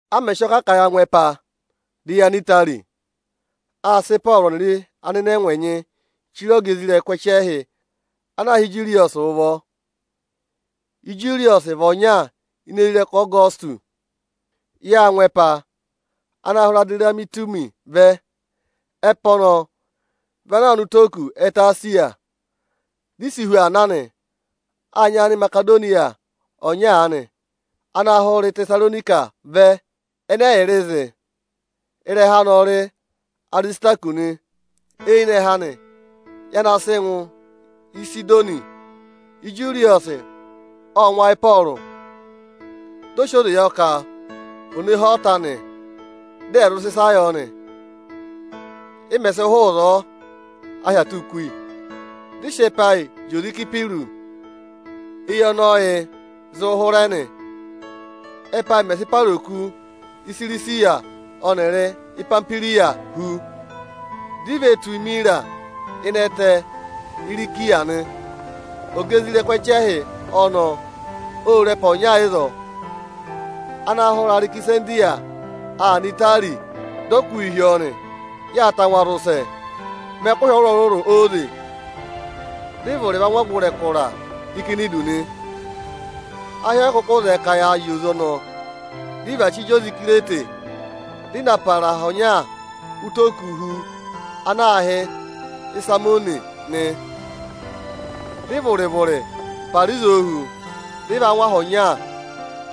A mẹ̀ sị ọọ kà ka ya ngụ ẹpa, dị ya nọ Itari, â sị Ịpọọrụ ọnịrị anịnẹngwa ẹnyị chire ọga isoja nịnị ẹchẹhị ana aā hị́ Ijuriyọsị ụvọ. Ijuriyọsị vị ọnya ini isoja nịnị Ọgọsịtọsị. Yâ ngụ ẹpa ana hụrẹ Adiramitumi vẹ. Ẹpa ọnọọ vị ana aa nọ ụtọ oku ẹtẹ Esiya. Di i si hu aa na nị. Â nyị Animasedoniya ọnya aanị ana hụrẹ Ịtẹsaronika vẹ ẹnẹ ẹyịrịị zị. Ịrẹha anị ọ rị Arisitakọsị nị. Eyinẹhẹ anị, ya na sị ngụ Ịsịdọnị. Ijuriyọsị, ộ ngụ ayị Ịpọọrụ, dị ọ sị oze yọ ka ò ne hee ọta anị, dị ẹ̀ zụ sị ịsa yọ nị. Ị mẹ̀ sị hụụ ịzọọ, ahị aa tụ́ kú yi, dị ị sị ẹpa ayị zị oze Ịsayịpịrụsị éyi ọnị ọyịị̄ zịị hụrẹ nị. Ẹ́pa ayị mẹ̀ sị para oku Isirisiya ọnịrị Ipamihwiriya hu, di i ve tù Imira ịnị ẹtẹ Irisiya nị. Ọga isoja nịnị ẹchẹhị ọnọọ ô re ẹpa ọnya ịzọọ, ana hụrẹ Arekisandiriya aa nọ Itari; dị ọ kụ́ yị hi ọọ nị. Yâ tangwa zị ụsẹ mẹ ẹkụhị ọrụrụ óze, dị ị vụrị va ngụ ọgụrị ẹkụra Ikinidu nị. Ahị ọyị kụkụ zẹẹ ka ya zị oze ọnọọ, dị ị va chí zị oze Ikirete, dị ị na para aha ọnya ụtọ oku hu ana aā hị́ Isarimone nị. Dị ị vụrị-vụrị para ịzọọ hu, dị ị va ngụ aha ọnya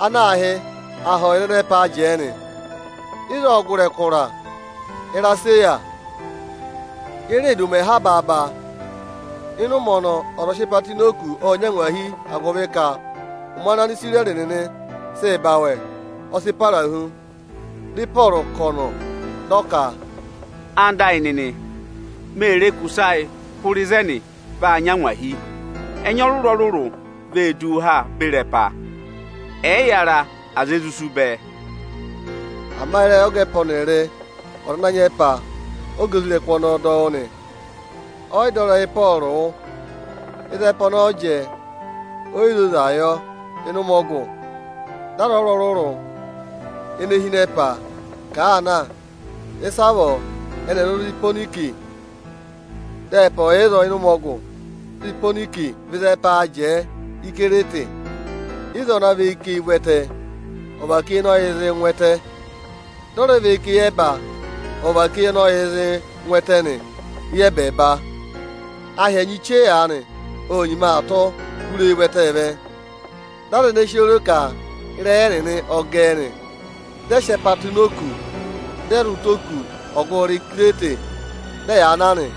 ana aā hị́ “Aha ọyịza ẹnẹ ẹpaā jẹẹ” nị. Ịzọọ ộ gụrị ẹkụra Iraseya. Ye reè du ụmẹ ha baaba; ịnị ụmẹ ọnọọ ọza ọ̀ọ sị ẹpa tụ́ ịnị oku, ộ nyị angwahi, agụvị ka ụmẹ ana Anisirẹrị nịnị sịị̄ ba awẹ, ọ sị para hu. Dị Ịpọọrụ kà ọ̀nọ̀ dị ọ ka, “Ẹwụ nịnị ẹyịnyara amị, mee re ka ụsẹ ayị hụrẹ ịzẹnị vaa nyị angwahi. Ẹnya ọrụrụ-ọrụrụ vee duu ha beri ẹpa. Ẹyịyara aza e zụ sú bẹẹ.” Ama ịrẹyị ọga ẹpa ọnịrị ọza ana nyị ẹpa ọ́ga isoja nịnị ọnọọ dọ wụ́ nị. Ọyị dọ ịrẹyị Ịpọọrụ wụ́. Ịzị ẹpa ọnọọ jẹẹ, oyi zoza yọ ịnị ụmẹ ọgụ, dị aza ọrụrụ-ọrụrụ ịnị ẹnị ene hi ịnị ẹpa ka àa na, ịsavọọ eni è zụ tù Iponiki, dị ẹpa ọ̀ yà ịzọọ ịnị ụmẹ ọgụ. Iponiki vị ịzị ẹpaā jẹẹ Íkirete. Ịzọọ vị ana và eyi ká eyi ụvẹtẹ ọ̀vàká eyi ọnị ọyịị̄ zịị ngụ ẹtẹ. Dị ọ rẹ và eyi ká eyẹba ọ̀vàká eyi ọnị ọyịị̄ zịị ngụ ẹtẹ nị eyi ẹbẹẹba. Ahị ẹnyị chee aanị ô nyima aa tụ́ hụrẹ eyi ụvẹtẹẹ vẹ. Dị aza ẹnẹẹ si oo ro ka ịrẹyị ẹnịnị ộ gẹẹ nị. Dị ẹ sị ẹpa tụ́ ini òkū, dị ẹ zị ụtọ oku ọgụrị Ikirete, dị ẹyaa na nị.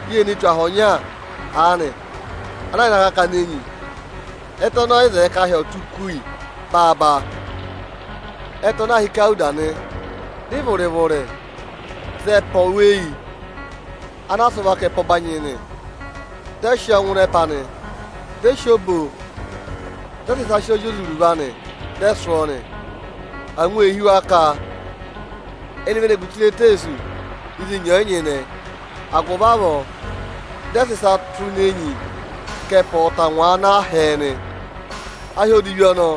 Yê ne tù aha ọnya aanị ana yà ịnị akakana enyi; ẹtẹ ọnọọ ọyị zẹẹ ka ahị ọ̀ tụ́ kú yi baaba. Ẹtẹ ọnọọ aā hị́ Ikawuda nị. Dị ị vụrị-vụrị za ẹpa oweyi anaa sụ́ vaka ẹpa ọbanyị nị. Dị ẹ sị ọọ ngụ ịnị ẹpa nị. Dị ẹ sị obo, dị ẹ sị ịsa sị ọọ zị oze iruvo anị, dị ẹ sụ́ ọọ nị. Angwa ee hí wa ka ẹnị ve ne gu chire eteesu ịzị enyi ọ̀ yị nyịnẹ. Agụvị avọọ dị ẹ sị ịsa tụ́ ini enyi ka ẹpa ọ̀ tangwaa na hẹẹ nị. Ahị odivi ọnọọ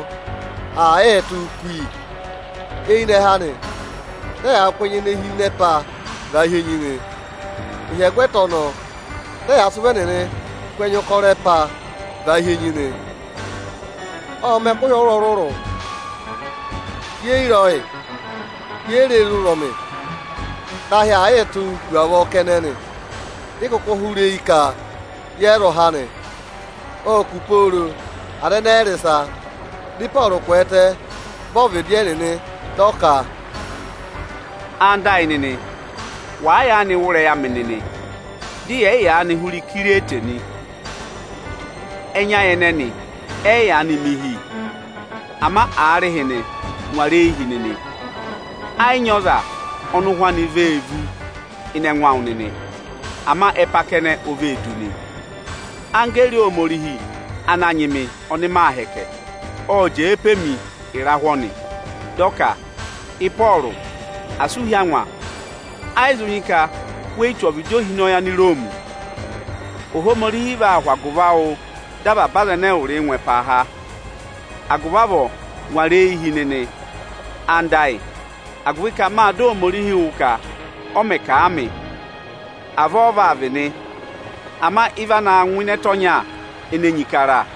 aa yịị tụ́ kú yi, eyinẹhẹ anị dị ẹyaa kụ́ ẹnya ene hi ịnị ẹpaa vàa hi enyi nị. Ịhyẹgwẹta ọnọọ, dị ẹyaa sị ụvọ ẹnịnịị kụ́ ẹnya ụkọrọ ẹpaa vàa hi enyi nị. Ộ mẹ ẹkụhị ọrụrụ-ọrụrụ, ye yi re ọyị, ye yi re re ụzọmị, dị ahị aa yịị tụ́ hu avọọ kẹnẹ nị. Di i kuku hụrẹ eyi ka yẹ yị zụ há nị. Ô kù pooro, aza ẹnẹẹ ẹyị rị ịsa. Dị Ịpọọrụ kwẹẹtẹ vẹ ọvịdị ẹnịnị, dị ọ ka, “Ẹwụ nịnị ẹyịnyara amị, wàa yaanị wụ́ ịrẹyị amị nịnị, dị yẹ̀ yị yaanị hụrẹ Ikirete nị, ẹnya ayị ẹnẹnị ẹ yị yaanị mẹ ịhị. Ama aarịhịnị ngwara eyi hi nịnị, ẹ yị nyị ọza ọnị ụhwẹ anị vee vú ịnị ẹngụ awụ nịnị. Ama ẹpa kẹnẹ o vee du nị. Anggẹẹrị Ohomorihi ana nyị mị, ọnị maa hẹkẹ, ộ jẹẹ pe mi ịrahụ”, dị ọ ka, “Ịpọọrụ, asị u hí angwa! Ẹ yị zụ nyị ka we yi tù ọvịdị ohinọyị Aniroomi. Ohomorihi vaa hụ agụvị awụụ dọ avaba aza ẹnẹ ẹwụrịị ngụ ẹpaa há. Agụvị avọọ, ngwara eyi hi nịnị, anda ayị, agụvị ka mâ dọ Ohomorihi wụ́ ka, ọ mẹ̀ kà a mị, avọọ ọ vaa vị nị. Ama ị va naa ngụ ịnị ẹtẹ ọnya, ene enyi kara.”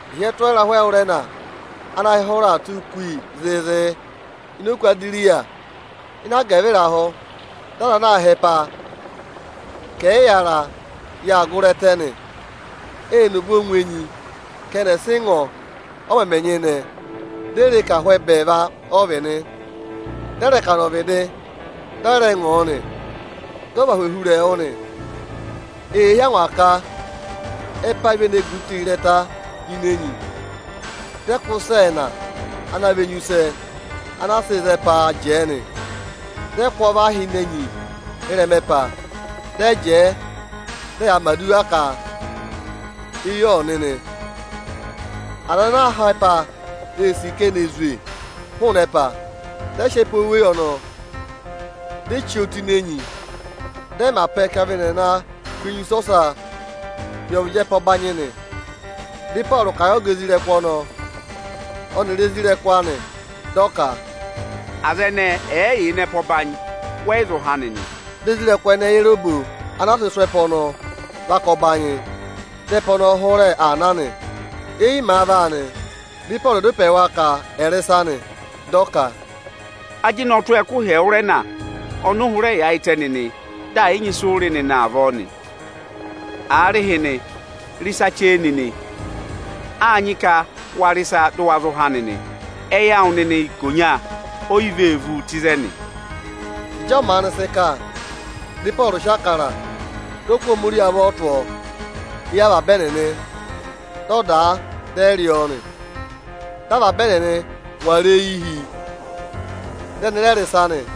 Ịhị ẹ tụ́ ọọ ịrahụ ẹwụrẹna, ana ahị hụrẹ aa tụ́ kú yi zịịzị ini Oku Adiriya, ịnị agẹvịrahụ dị aza ana aa họ̀ ẹpa ka ẹyịyara yaa gụrị ẹtẹ nị. Ê ne obo ngụ enyi ka ẹnị ẹ̀ sị mọ ọ, ọ mẹmẹ nyịnẹ. Di e re ka ahụ ẹbẹẹva ọ vị nị. Dị ẹ rẹ kà nọ ọvịdị, dị ẹ rẹ mọ ọ nị. Dị ọ vị ahụ ohurẹẹwụ nị. Eyee hí angwa ka ẹpa ayị ve ne gu chire ịrẹta ini enyi, dị ẹ kụ́ ịsa ẹẹna ana vị enyusẹ anaa sịị̄ za ẹpaa jẹẹ nị. Dị ẹ kụ́ ọọ và hi ini enyi ị́rẹma ẹpa, dị ẹ jẹẹ dị ẹyaa mẹ̀ aduwa ka eyi ọ̀ nị nị. Aza ana aa họ̀ ẹpa ee sì ka eni è zwe hụụnị ẹpa, dị ẹ sị ẹpa oweyi ọnọọ, di e chí ọọ tụ́ ini enyi, dị ẹ mẹ apẹ ka vị ẹnị aa naa kụ́ enyusẹ ọsaa hi ọvịdị ẹpa ọbanyị nị. Dị Ịpọọrụ kà a yị ọga isoja nịnị ọnọọ ọnịrị isoja nịnị anị dị ọ ka, “Aza ẹnẹẹ ẹ̀ yị yà ịnị ẹpa ọbanyị, wẹ yị zụ há nịnị.” Dị isoja nịnị ẹnẹẹ yẹrẹ obo anaa sị sụ́ ẹpa ọnọọ vaka ọbanyị, dị ẹpa ọnọọ hụrẹ aa na nị. Éyi màa vaa nị, dị Ịpọọrụ dá ịpẹ yị wa ka ẹ̀ rị ịsa nị. Dị ọ ka, “Ajịnị ọ tụ́ ọọ ẹkụhị ẹwụrẹna ọnị ụ hụrẹ yaayịtẹ nịnị dị ẹ̀yị nyị ịsị ụ rị nịnị avọọ nị. Aarịhịnị, rị ịsa chee nịnị! Â nyị ka wa rị ịsa, dụ wa zụ há nịnị. Ẹyị awụ nịnị ikonya oyi vee vu tụ́ ịzẹnị.” Ịjị ọ maanị sị kà, dị Ịpọọrụ sị Ịbụrẹẹdị, dị ọ kụ́ Ohomorihi avọ tụ́ ọọ éyi avaba ẹnịnị, dị ọ dàa dị aa rị ọọ nị. Dị avaba ẹnịnị ngwara eyi hi, dị ẹnị rẹ rị ịsa nị.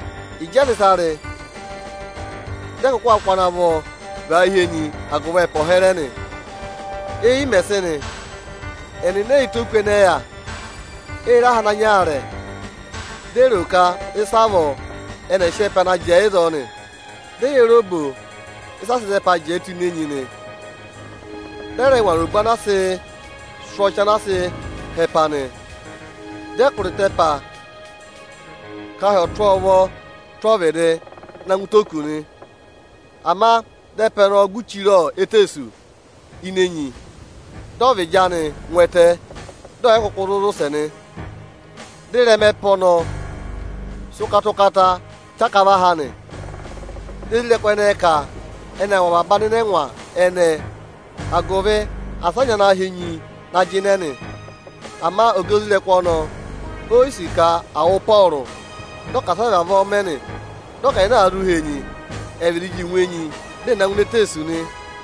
Ịjị ẹ sị ịsa rị, dị ẹ kụ́ akụ ana vọ và hi enyi agụvị ẹpa ọ̀ hẹrẹ nị. Éyi mẹ̀ sị nị, ẹnịnị ẹyị yẹ ụtọ oku ẹnẹẹ yà. Ệ re aha ana nyị aarẹ, di e ro ka ịsavọọ ẹnị ẹ̀ sị ẹpa naa jẹẹ ịzọọ nị. Dị ẹ yẹrẹ obo ịsị a sịị̄ za ẹpaa jẹẹ tụ́ ini enyi nị. Dị ẹ rẹ ngwara obo anaa sị sụ́ ọchị anaa sịị̄ họ̀ ẹpa nị. Dị kụ̀rà ịta ẹpa ka ahị ọ̀ tụ́ ọọ ụvọọ tụ́ ọvịdị na ngụ ụtọ oku nị. Ama dị ẹpa ne gu chire eteesu ini enyi, dị ọvịdị anị ngụ ẹtẹ, dị ọ̀yị kụkụ zụ zị ụsẹ nị. Dị ịrẹma ẹpa ọnọọ sị ụkata-ụkata chaka và ha nị. Dị isoja nịnị ẹnẹẹ ka ẹnị aa wụ̀ avaba anịnẹngwa ẹnẹẹ, agụvị asị a nyị ana họ̀ enyi na jịnẹ nị. Ama ọga isoja nịnị ọnọọ oyi sì ka à wụ Ịpọọrụ, dị ọ ka asị ẹ vavọọ mẹ nị. Dị ọ ka aza ana àa zụ họ̀ enyi, è vịdị ji ngụ enyi, dị ẹ̀ na ngụ ini eteesu nị.